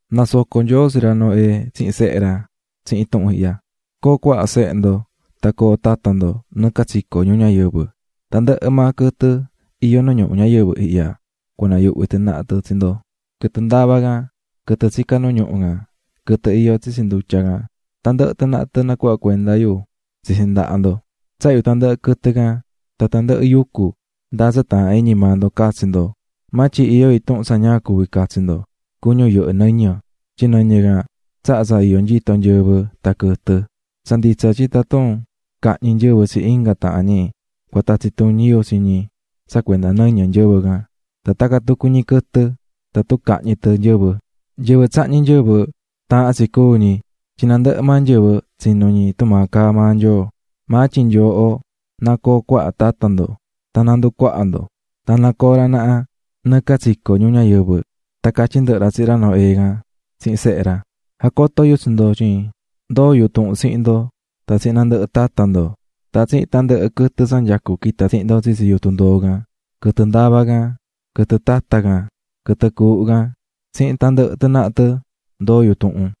Nasoco̱ Nyoo tsi ra Noé tsihin sehe ra tsihin tuhun ihya: "Co̱o cuaha sehe ndo, tan co̱o tata ndo nɨɨ catsico ñuu ñayɨvɨ. Tandɨhɨ maa quɨtɨ iyó nu ñuhu ñayɨvɨ ihya cua nayuhvi tɨ naha tɨ tsi ndo, quɨtɨ ndavá can, quɨtɨ tsicá nu ñuhu can, quɨtɨ iyó tsitsi ndutya can, tandɨhɨ tɨ naha tɨ nacuhvá cuenda yu tsitsi ndaha ndo. Tsahá yu tandɨhɨ quɨtɨ can, tan tandɨhɨ yucu, ndáa tsa taahán iñi maa ndo catsi ndo. Maa tyin iyó intuhun tsa ña cuví catsi ndo: cuñu yɨhɨ́ nɨñɨ, tyin nɨñɨ can tsahá tsa iyó nyito nyɨvɨ tan quɨtɨ. Tsa nditsa tyin tatun cahñi nyɨvɨ tsi inga tahan ñi, cua tatsi tuñi yu tsi ñi tsa cuenda nɨñɨ nyɨvɨ can, tan tacan tucu ñi quɨtɨ tatun cahñi tɨ nyɨvɨ. "Nyɨvɨ tsahñí nyɨvɨ, taahán tsi cúu ñi. Tyin nandɨhɨ maa nyɨvɨ tsinu̱ ñi tumaa caá maa yu tsa cuví yu Nyoo. Maa tyin nyooho na coo cuaha tata ndo tan na nducuaha ndo. Tan na coo ra naha nɨɨ catsico ñuu ñayɨvɨ." Tan catyí ndɨhɨ ra tsihin ra Noé can tsihin sehe ra: "Jacotó yu tsi ndo tyin ndoó yu tuhun tsihin ndo, tan tsihin nandɨhɨ tata ndo, tan tsihin tandɨhɨ quɨtɨ tsa nyacú quita̱ tsihin ndo tsitsi yutun ndoo ihya: quɨtɨ ndavá can, quɨtɨ tata can, quɨtɨ cuuhu can tsihin tandɨhɨ tɨ naha tɨ ndoó yu tuhun.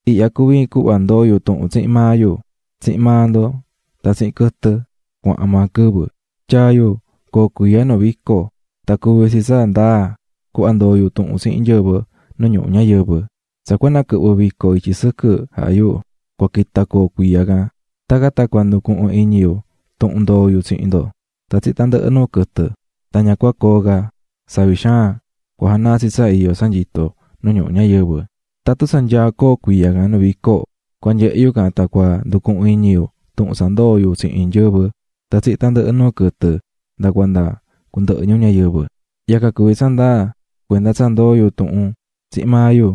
"Ihya cuví iin cuhva ndoó yu tuhun tsihin maa yu, tsihin maa ndo tan tsihin quɨtɨ, cuahan maa quɨvɨ: Tyaa̱ yu coo cuiya nu vico, tan cuví tsi tsa ndaa cuhva ndoo̱ yu tuhun tsihin nyɨvɨ nu ñuhu ñayɨvɨ. Tsa cua naquɨhvɨ vico ityi sɨquɨ jaha yu, cua quita coo cuiya can. Tacan tan cua nducuhun iñi yu tuhun ndoo̱ yu tsihin ndo tan tsihin tandɨhɨ nuu quɨtɨ, tan ña cua coo ca savi xaan cua janaa tsi tsa iyó tsa nyito nu ñuhu ñayɨvɨ. Tatun tsa nyaá coo cuiya can nu vico, cua nyehe yu can tan cua nducuhun iñi yu tuhun tsa ndoo̱ yu tsihin nyɨvɨ tan tsihin tandɨhɨ nuu quɨtɨ nda cuanda cundɨhɨ ñuu ñayɨvɨ. Yacan cuví tsa ndaa cuenda tsa ndoo̱ yu tuhun tsihin maa yu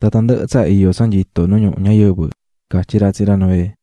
tan tandɨhɨ tsa iyó tsa nyito nu ñuhu ñayɨvɨ", catyí ra tsihin ra Noé.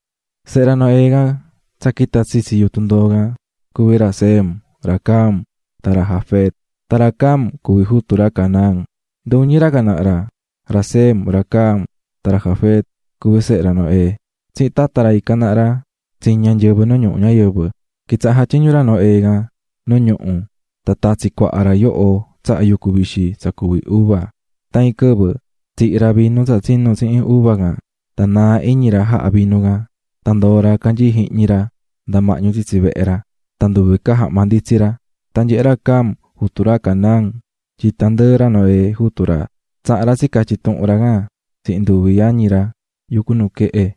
Sehe ra Noé tsa quita̱ tsitsi yutun ndoo tsihin ra cuví ra Sem ra Cam tsihin ra Jafet. Tan ra Cam cuví jutu ra Canaán. Nduñi ra ihya naha ra, ra Sem, ra Cam tan ra Jafet cuví sehe ra Noé, tsihin tata ra ican naha ra tsiña̱ nyɨvɨ nu ñuhu ñayɨvɨ. Quitsaha̱ jatyiñú ra Noé can nu ñuhu, tan tatsi̱ cuaha ra yoho tsahá yucu vixi tsa cuví uva. Tan iin quɨvɨ tsihí ra vinu tsa tsinú tsihin uva can, tan naa̱ iñi ra jaha̱ vinu can. Tan ndoo̱ ra canyií jihñi ra mahñu tsitsi vehe ra tan nduve ca jahma nditsí ra. Tan nyehe̱ ra Cam, jutu ra Canaán, tyin tandɨɨ ra Noé, jutu ra, tsaha̱n ra catyi̱ tuhun ra can tsihin nduvi yañi ra yucú nuquehe.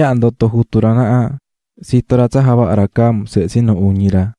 Tsa ndoto̱ jutu ra naha, tsito̱ ra tsa javaha̱ ra Cam sehe tsinu uñi ra.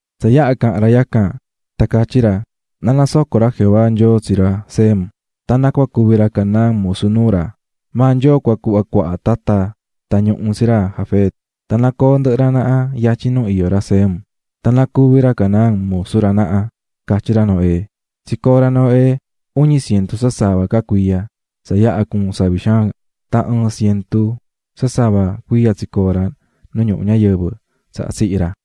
Tsa yaha caha̱n ra yacan, tan catyí ra: "Ná nasoco ra Jehová, Nyoo yu, tsi ra Sem, Tan na cuvi ra Canaán musu nuu ra. ¡Maa Nyoo cua cuhva cuaha tata tan ñuhu tsi ra Jafet! ¡Tan na co̱o ndɨhɨ ra naha yatyin nu iyó ra Sem, tan na cuvi ra Canaán musu ra naha!", catyí ra Noé. Tsicoo̱ ra Noé uñi cientu sasava ca cuiya tsa yaha cuu̱n savi xaan. Tan ɨɨn cientu sasava cuiya tsicoo̱ ra nu ñuhu ñayɨvɨ tsaha tsihi̱ ra.